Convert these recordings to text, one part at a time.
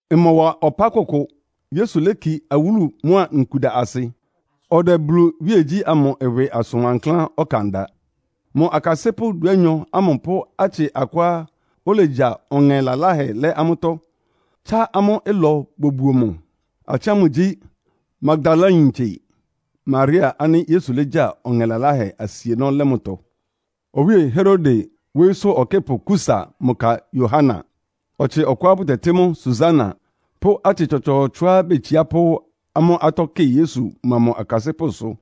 Ɩmɔwa ɔpá kʋkʋ, Yesu léki awúlu mʋ́a nkuda asɩ, ɔdɛ Bulu iwíegyí ámʋ ɩwɩ asʋn wankláán ɔkan da. Mʋ akasɩ́pʋ́ dúanyɔ ámʋ pʋ́ atsɩ akʋá olegya ɔŋɛ laláhɛ lɛ́ amʋ́tɔ́, tsá amʋ́ ɩlɔ bobuo mʋ. Atsɩ ámʋ gyí, Magdalayintse Maria ánɩ́ Yesu légya ɔŋɛ laláhɛ asienɔ́ lɛ́ mʋtɔ. Owíe Herode wóyísʋ́ ɔkɩ́pʋ Kusa mʋ ka Yohana. Ɔtsɩ ɔkʋá bʋtɛtɩ́ mʋ Susana pʋ́ atsɩ tsɔtsɔɔtsɔá betsiá pʋ́ amʋ́ atɔ́ kɩ Yesu mʋa mʋ akasɩ́pʋ́sʋ.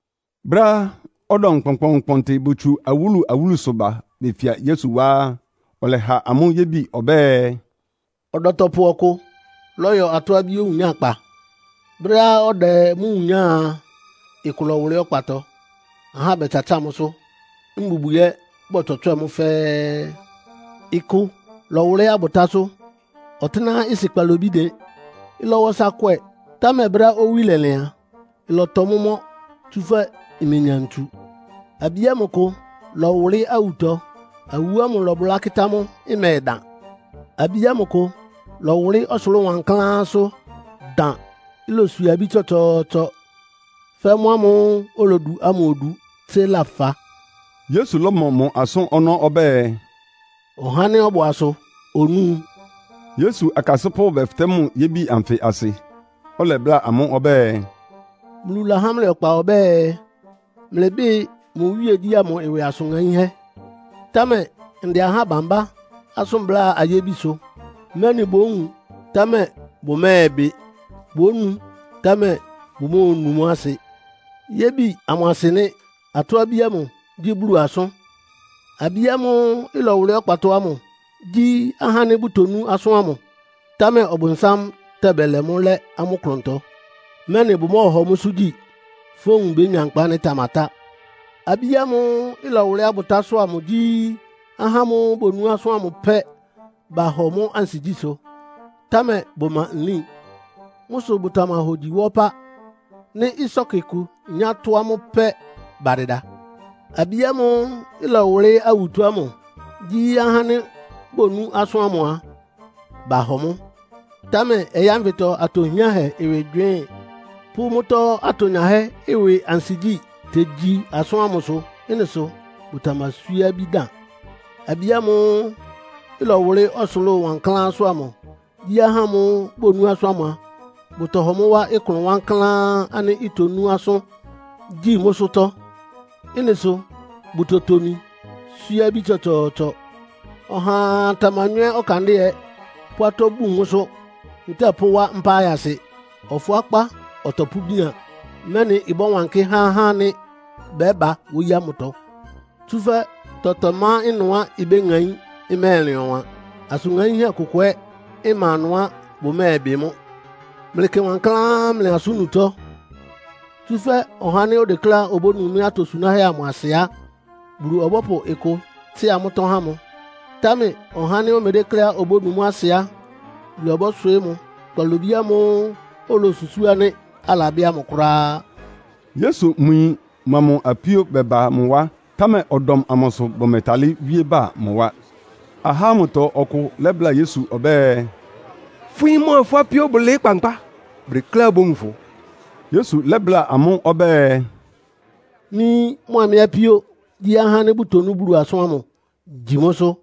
Brɛ́á ɔdɔm kpɔnkpɔɔnkpɔntɩ botsu awúlu-awúlusʋ ba befia Yesu wá á, ɔlɛha amʋ́ yébi ɔbɛ́ɛ, “Ɔdɔtɔpʋ ɔkʋ lɔ́yɔ atɔ́-abí owunyákpa. Brɛ́á ɔdɛ mʋ́ wunyáa a, ɩkʋ lɔ́wʋlɩ́ ɔkpatɔ, ahá bɛtsatsáa mʋ́sʋ́, mbubwi ɛ́ bɔtswɛtswɛ́ɛ mʋ́ fɛ́ɛ́. Ɩkʋ lɔ́wʋlɩ́ abʋtásʋ́, ɔtɩ́nɛ́á ɩsɩ kpalobí dɩn. Ɩlɔwa ɔsa kwɛ, támɛ brɛ́á owí lɛlɩn a, ɩlɔtɔ mʋ́ mɔ́, tsúfɛ́ imenya ntsu. Abí ámʋ kʋ lɔwʋlɩ́ awutɔ, awu ámʋ lɔbʋlá kɩ́tá mʋ́, ɩmɛdan. Abí ámʋ kʋ lɔwʋlɩ́ ɔsʋlʋ́ʋ wankláánsʋ́, dan. Iloswie abí tsɔtsɔɔtsɔ fɛ́ mʋ́ ámʋ́ʋ́ olodu ámʋ odu tsé lafa.” Yesu lɔ́mɔ mʋ asʋ́n ɔnɔ́ ɔbɛ́ɛ, “Ɔhá ánɩ́ ɔbʋ asʋ onúu.” Yesu akasɩ́pʋ́ bɛfɩtɛ́ mʋ yébi anfɩ asɩ. Ɔlɛbláa amʋ́ ɔbɛ́ɛ, “Bulu lahá mlɩ ɔkpa ɔbɛ́ɛ, mlɩbɩ́ɩ mʋ iwíegyí ámʋ ɩwɩ asʋn ŋaínhɛ́. Támɛ ndɛ aha bambá asʋ́n bláa ayébisʋ, mɛ́nɩ bówun, támɛ bʋmɛ́ɛbɩ. Bónu, támɛ bʋmóonu mʋ́ asɩ. “Yébi amʋ asɩ nɩ́. Atɔ́-abí ámʋ gyí Bulu asʋ́n. Abí ámʋ́ʋ́ ɩlɔwʋlɩ́ ɔkpatɔ ámʋ gyí ahá ánɩ́ bʋtonú asʋ́n ámʋ, támɛ Ɔbʋnsám tɛba bɛlɛ mʋ́ lɛ́ amʋ́ klʋntɔ, mɛ́nɩ bʋmɔ́ɔhɔ mʋ́sʋ́ gyi, fówun bénya nkpa ánɩ́ ɩtamatá. Abí ámʋ́ʋ́ ɩlɔwʋlɩ́ abʋtásʋ́ amʋ gyí ahá ámʋ́ʋ́ bonú asʋ́n ámʋ pɛ́, bahɔ mʋ́ ansigyísʋ́, támɛ bʋma nlín. Mʋ́ sʋ bʋtamahogyi wa ɔpá. Nɩ́ ɩsɔ́kɩ kʋ inyá tʋ́ amʋ́ pɛ́, badɩda. Abí ámʋ́ʋ́ ɩlɔwʋlɩ́ awutɔ ámʋ gyí ahá ánɩ́ bonú asʋ́n ámʋ a, bahɔ mʋ́, támɛ ɔyɩ́ ánfɩtɔ atɔ hiánhɛ ɩwɩ gywɩɩ́n, pʋ́ mʋ́tɔ́ atonyahɛ́ ɩwɩ ansigyí tegyi asʋ́n ámʋsʋ. Ɩ́nɩ sʋ bʋtamaswíé abí dan. Abí ámʋ́ʋ́ ɩlɔwʋlɩ́ ɔsʋlʋ́ʋ wankláánsʋ́ ámʋ gyí ahá ámʋ́ʋ́ bonú asʋ́n ámʋ a, bʋtɔhɔ mʋ wá klʋn wankláán ánɩ́ itonú asʋ́n, gyi mʋ́sʋ́tɔ́. Ɩ́nɩ sʋ bʋtotomi swíé abí tsɔtsɔɔtsɔ. “Ɔhaa tamanywɛ́ ɔkandɩ́ɛ pʋ́ atɔ́ bun mʋ́sʋ́, ntɛ́ɛ pʋ́wá mpá ayasɩ. Ɔfʋákpá ɔtɔpʋ́bian, mɛ́nɩ ɩbɔ́wankɩ́ há ahá ánɩ́ bɛ́ba wóyí ámʋtɔ. “Tsúfɛ́ tɔtɔ má ɩnʋá ibéŋaín, ɩmɛ́ɛlɩn ɔwan. Asʋn ŋaínhɛ́ kʋkʋ ɛ́ ma ɩnʋá bʋmɛ́ɛbɩ mʋ́. “Mlɩkɩ wankláán mlɩ asʋ́n-nutɔ́. Tsúfɛ́ ɔhá ánɩ́ odekléá obónu mɩ́ atosunáhɛ́ amʋ asɩ á, Bulu ɔbɔ́pʋ ɩkʋ tsɩ́a mʋ́tɔ́ há mʋ. Támɛ ɔhá ánɩ́ omedékléá obónu mʋ́ asɩ á, Bulu ɔbɔ́swɩɩ́ mʋ kpalobí ámʋ́ʋ́ olosusúu ánɩ́ alabɩ́ ámʋ kʋ́ráá.” Yesu mʋ yin mʋa mʋ apíó bɛba mʋ wá, támɛ ɔdɔm amʋ sʋ bʋmɛtalɩ́ wíé ba mʋ wá. Ahá ámʋtɔ ɔkʋ lɛ́bláa Yesu ɔbɛ́ɛ, “Fʋ́ yín mʋa fʋ́ apíó bʋlɩɩ́ kpankpá, bʋdekléá bówun fʋ.” Yesu lɛ́bláa amʋ́ ɔbɛ́ɛ, “Mɩ́ yín mʋa mɩ́ apíó gyí ahá ánɩ́ bʋtonú Bulu asʋ́n ámʋ, gyi mʋ́sʋ́.”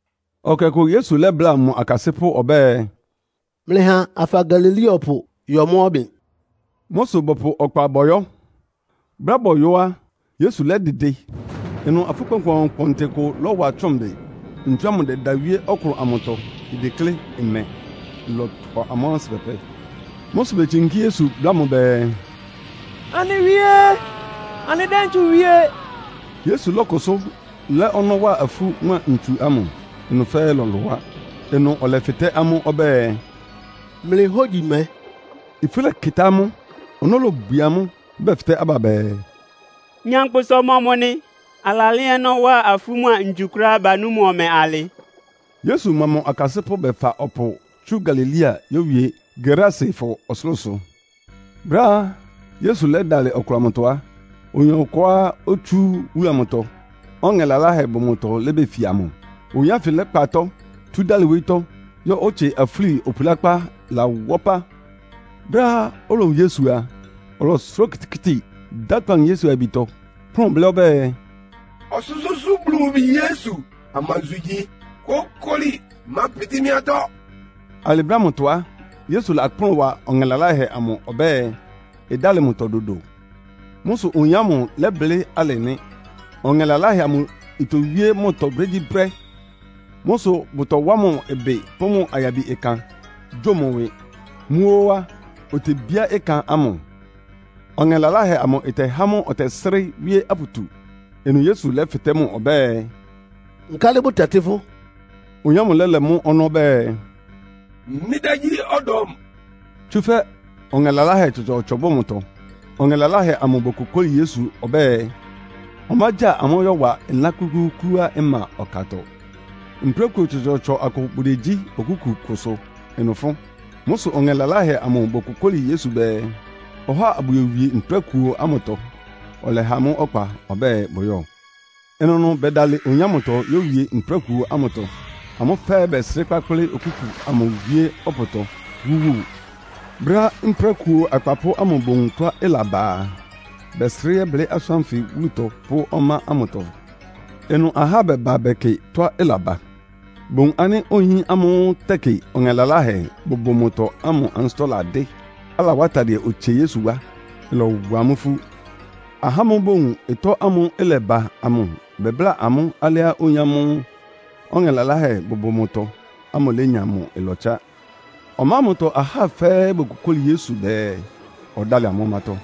Ɛkɛ ɔkʋ Yesu lɛ́bláa mʋ akasɩ́pʋ́ ɔbɛ́ɛ, “Mlɩha afa Galilea ɔpʋ yɔ mʋ́ ɔbɩn.” Mʋ́ sʋ bɔpʋ ɔkpa bɔyɔ́. Brɛ́á bɔyɔ́ á, Yesu lɛ́dɩdɩ. Ɩnʋ afú kpɔnkpɔɔnkpɔntɩ kʋ lɔ́wa tsʋ́ʋn bɩ. Ntsu ámʋ ɩdɛda wíé ɔklʋn amʋtɔ, ideklé ɩmɛ. Ɩlɔtʋ amʋ́ ansɩ́ pɛpɛ. Mʋ́ sʋ betsinkí Yesu, bláa mʋ bɛɛ, “Anɩ Wíe! Anɩdɛ́ ntsu wie!” Yesu lɔ́kʋsʋ́ lɛ́ ɔnɔ́ wa afú mʋ́a ntsu ámʋ, ɩnʋ fɛ́ɛ́ lɔlʋá. Ɩnʋ ɔlɛfɩtɛ́ amʋ́ ɔbɛ́ɛ, “Mlɩ hógyi mɛ?” Ifú lɛkɩtá amʋ́, ɔnɔ́ lobwie amʋ́, bɛfɩtɛ́ aba bɛɛ, “Nyankpʋsa ɔmɔmʋ nɩ, alalɛ́ ɔnɔ́ wa afú mʋ́a ntsu kʋ́ráá, banú mʋ ɔmɛ alɩ?” Yesu mʋa mʋ akasɩ́pʋ́ bɛfa ɔpʋ tsú Galilea yówie Gerasefɔ ɔsʋlʋ́sʋ. Brɛ́á Yesu dɛ́dalɩ ɔklʋn amʋtɔ á, oyin ɔkʋá otsú wúlu amʋtɔ, ɔŋɛ laláhɛ bʋ mʋtɔ lébefia mʋ. Oyin ánfɩ lɛ́kpa atɔ́, tú dálɩ wóyítɔ́, yɔ́ otsie afúli opulákpá ɩlawá ɔpá. Brɛ́á olowun Yesu a, ɔlɔsʋrá okitikíti, dá akpawunu Yesu ayabitɔ, kplʋ́n blɩ́ ɔbɛ́ɛ, “Ɔsʋ́sʋ́ʋ́sʋ́ Bulu mʋ Bi Yesu, amansʋ igyi? Kókoli, mápɩtɩ́ mɩ́ atɔ́.” Alɩ brɛ́ ámʋtɔ á, Yesu lakplʋ́n wa ɔŋɛ laláhɛ amʋ ɔbɛ́ɛ, ɩdálɩ mʋtɔ dodo. Mʋ́ sʋ oyin ámʋ lɛ́blɩ́ alɩ nɩ́. Ɔŋɛ́ laláhɛ amʋ itowíé mʋtɔ brégyíbrɛ́. Mʋ́ sʋ bʋtɔwá mʋ ɩbɩ pʋ́ mʋ ayabi ɩkan, gyo mʋ ɩwɩ. Mʋ́ óó á, otebíá ɩkan amʋ, ɔŋɛ laláhɛ amʋ ɩtɛhá mʋ ɔtɛsrɩ́ wíé aputu. Ɩnʋ Yesu lɛ́fɩtɛ́ mʋ ɔbɛ́ɛ, “Nkálɩ bʋtɛtɩ́ fʋ́?” Oyin ámʋ lɛ́lɛ́ mʋ́ ɔnɔ́ ɔbɛ́ɛ, “Mɩ́ dá gyí ‘Ɔdɔm.’” Tsúfɛ́ ɔŋɛ laláhɛ tsɔtsɔɔtsɔ bʋ mʋtɔ. Ɔŋɛ laláhɛ amʋ bokokóli Yesu ɔbɛ́ɛ, ɔmágya amʋ́ yɔ́wa ɩlán klúklúúklúá ɩma ɔkatɔ. Mprákuo tsɔtsɔɔtsɔ akʋ bʋdegyí okúku kʋsʋ ɩnʋ fʋ́n. Mʋ́ sʋ ɔŋɛ laláhɛ amʋ bokokóli Yesu bɛɛ, ɔhá abʋyowie mprákuo ámʋtɔ. Ɔlɛha amʋ́ ɔkpa ɔbɛ́ɛ bʋyɔ́. Ɩnʋnʋ bɛdalɩ oyin ámʋtɔ yówie mprákuo ámʋtɔ, amʋ́ fɛ́ɛ́ bɛsrɩ́ kpákplɩ́ okúku amʋ wíé ɔpʋtɔ, wúwu. Brɛ́á mprákuo akpapʋ́ ámʋ bowun tɔ́á ɩlaba a, bɛsrɩ́ yɛ́blɩ́ asʋ́n ánfɩ wúlutɔ pʋ́ ɔmá ámʋtɔ. Ɩnʋ ahá bɛba bɛkɩ tɔ́á ɩlaba. Bowun ánɩ́ oyin ámʋ́ʋ́ tɛkɩ ɔŋɛ laláhɛ bʋbʋ mʋtɔ ámʋ ansɩ́tɔ́ ladɩ́, alawá atadɩɛ otsie Yesu wá. Ɩlɔwa amʋ́ ifú. Ahá ámʋ́ʋ́ bowun ɩtɔ́ ámʋ́ʋ́ ɩlɛba amʋ bɛbláa amʋ́ alɩá oyín ámʋ́ʋ́ ɔŋɛ laláhɛ bʋbʋ mʋtɔ ámʋ lénya mʋ ɩlɔtsá. Ɔmá ámʋtɔ ahá fɛ́ɛ́ bokokóli Yesu bɛɛ, ɔdálɩ amʋ́ ɔmátɔ́,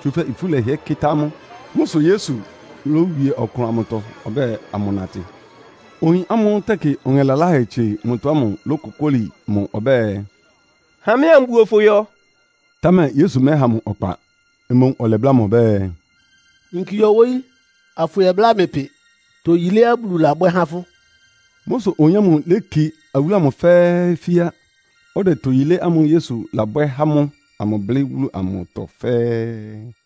tsúfɛ́ ifú lɛhɩɛ kɩ́tá amʋ́. Mʋ́ sʋ Yesu lówie ɔklʋn amʋtɔ ɔbɛ́ɛ amʋnatɩ. Oyin ámʋ́ʋ́ tɛkɩ ɔŋɛ laláhɛ tsie mʋtɔ ámʋ lókokóli mʋ ɔbɛ́ɛ, “Ha mɩ́ ambuo fʋ yɔ.” Támɛ Yesu mɛ́ha mʋ ɔkpa. Mboún ɔlɛbláa mʋ ɔbɛ́ɛ, “Yinki yɔ wóyí, afʋyɛbláa mlɩ pɩ toyiléá Bulu labwɛ́ há fʋ́.” Mʋ́ sʋ oyin ámʋ léki wúlu amʋ fɛ́ɛ́ fíá, ɔdɛ toyilé ámʋ́ʋ́ Yesu labwɛ́ há mʋ amʋ blɩ́ wúlu amʋtɔ fɛ́ɛ́.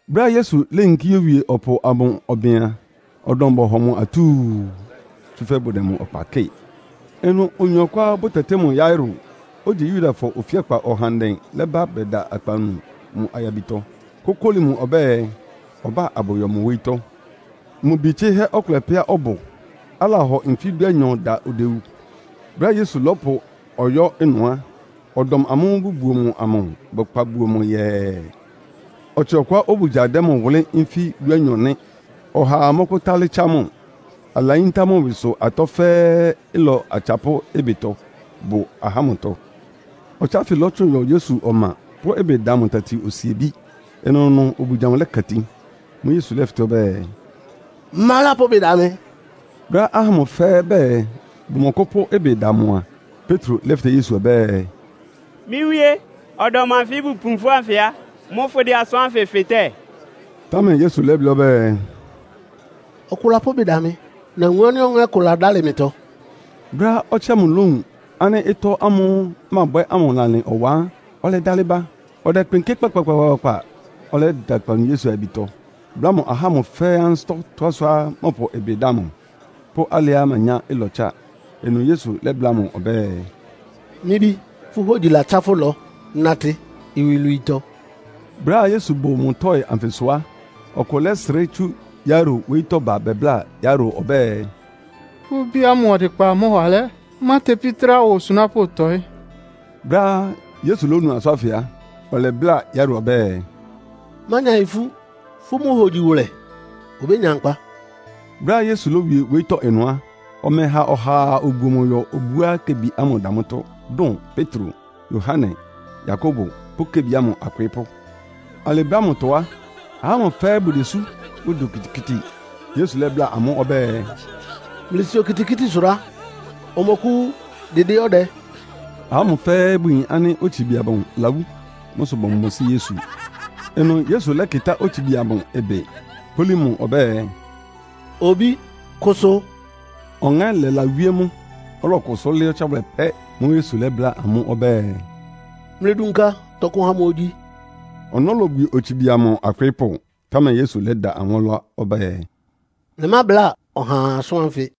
Brɛ́á Yesu léyinkí yówie ɔpʋ amʋ ɔbɩn a, ɔdɔm bɔhɔ mʋ atúu, tsúfɛ́ bʋdɛ mʋ ɔkpa kɩ́ɩ. Ɩnʋ oyin ɔkʋá bʋtɛtɩ́ mʋ Yairo, ogyi Yudafɔ ofíakpa ɔhandɛ lɛ́ba bɛda akpawunu mʋ ayabitɔ, kókóli mʋ ɔbɛ́ɛ, ɔbá abʋyɔ mʋ wóyítɔ́. Mʋ bi tsɩ́hɛ́ ɔkʋlɛ pɛ́á ɔbʋ, alahɔ nfí dúanyɔ da odewu. Brɛ́á Yesu lɔ́pʋ ɔyɔ́ ɩnʋ á, ɔdɔm amʋ́ʋ́ bʋbuo mʋ amʋ bɛkpa buo mʋ yɛɛ. Ɔtsɩ ɔkʋá obugya dɛ mʋ wʋlɩ́ nfí dúanyɔ nɩ́, ɔhaa mɔ́kʋ́tálɩ́ tsá mʋ, alayíntá mʋ́ ɩwɩsʋ atɔ́ fɛ́ɛ́ ɩlɔ atsapʋ́ ɩbɩtɔ bʋ ahá ámʋtɔ. Ɔtsɩ ánfɩ lɔ́tsʋn yɔ Yesu ɔma, pʋ́ ɩbɩ da mʋ tati osiebí. Ɩnʋnʋ obugya amʋ lɛka itin. Mʋ́ʋ́ Yesu lɛ́fɩtɛ́ ɔbɛ́ɛ “Ma lápʋ́ ɩbɩ da mɩ?” Brɛ́á ahá ámʋ fɛ́ɛ́ bɛɛ bʋmɔkʋ́pʋ́ ɩbɩ da mʋ a, Petro lɛ́fɩtɛ́ Yesu ɔbɛ́ɛ, “Mɩ́ Wíé, ɔdɔm anfɩ́ bʋpu fʋ́ ánfɩ á, mʋ́ fʋ́dɛ asʋ́n ánfɩ fɩtɛ́?” Támɛ Yesu lɛ́blɩ́ ɔbɛ́ɛ, “Ɔkʋ lapʋ́ ɩbɩ da mɩ. Nawun ánɩ́ ɔŋɛ́ kʋ ladálɩ mɩtɔ.” Brɛ́á ɔtsɩ ámʋ lówun ánɩ́ ɩtɔ́ ámʋ́ʋ́ mabwɛ́ ámʋ lalɩn ɔwan á, ɔlɛdalɩ ba. Ɔdɛkpɩnkɩ́ kpakpakpakpa, ɔlɛyɛ́da akpawunu Yesu ayabitɔ, bláa mʋ ahá ámʋ fɛ́ɛ́ ansɩ́tɔ́ tɔ́á sʋá mɔpʋ ɩbɩ da mʋ, pʋ́ alɩá manyá ɩlɔtsá. Ɩnʋ Yesu lɛ́bláa mʋ ɔbɛ́ɛ, “Mɩ́ bí, fʋ́ hógyi latsá fʋ́ ɩlɔ. Natɩ iwilwiitɔ.” Brɛ́á Yesu bʋ mʋ tɔ́ɩ anfɩsʋ á, ɔkʋ lɛ́srɩ́ tsú Yairo wóyítɔ́ ba bɛbláa Yairo ɔbɛ́ɛ, “Fʋ́ bí ámʋ ɔdɩkpa mɔwa alɛ́. Mátepí trá wa osunápʋ́ tɔ́ɩ.” Brɛ́á Yesu lónu asʋ́n ánfɩ á, ɔlɛbláa Yairo ɔbɛ́ɛ, “Mánya ifú. Fʋ́ mʋ́ hogyi wʋlɛ, obénya nkpa.” Brɛ́á Yesu lówie wóyítɔ́ ɩnʋ á, ɔmɛha ɔhaa obuo mʋ yɔ obuá kebi ámʋ da mʋ́tɔ́, dʋn Petro, Yohane, Yakobo pʋ́ kebi ámʋ akwɩɩ́pʋ́. Alɩ brɛ́ ámʋtɔ á, ahá ámʋ fɛ́ɛ́ bʋdesú, bʋdɛ okitikíti. Yesu lɛ́bláa amʋ́ ɔbɛ́ɛ, “Mlɩsi okitikíti sʋrá. Ɔmɔkʋ́wú, dɩdɩ́ ɔdɛ.” Ahá ámʋ fɛ́ɛ́ bʋyin ánɩ́ otsibi amʋ lawú. Mʋ́ sʋ bɔmɔsɩ́ Yesu. Ɩnʋ Yesu lɛ́kɩtá otsibi amʋ ɩbɩ, kpólí mʋ ɔbɛ́ɛ, “Obí, kʋsʋ!” Ɔŋɛ́ lɛlawíé mʋ, ɔlɔkʋsʋ́ lɩ́ɩ́ ɔtsáwʋlɛ pɛ́. Mʋ́ʋ́ Yesu lɛ́bláa amʋ́ ɔbɛ́ɛ, “Mlɩdunka tɔkʋ ha mʋ ogyi.” Ɔnɔ́ lobwie otsibi amʋ akwɩɩ́pʋ́, támɛ Yesu lɛ́da amʋ́ ɔlá ɔbɛ́ɛ, “Mlɩmábláa ɔhaa asʋ́n ánfɩ.”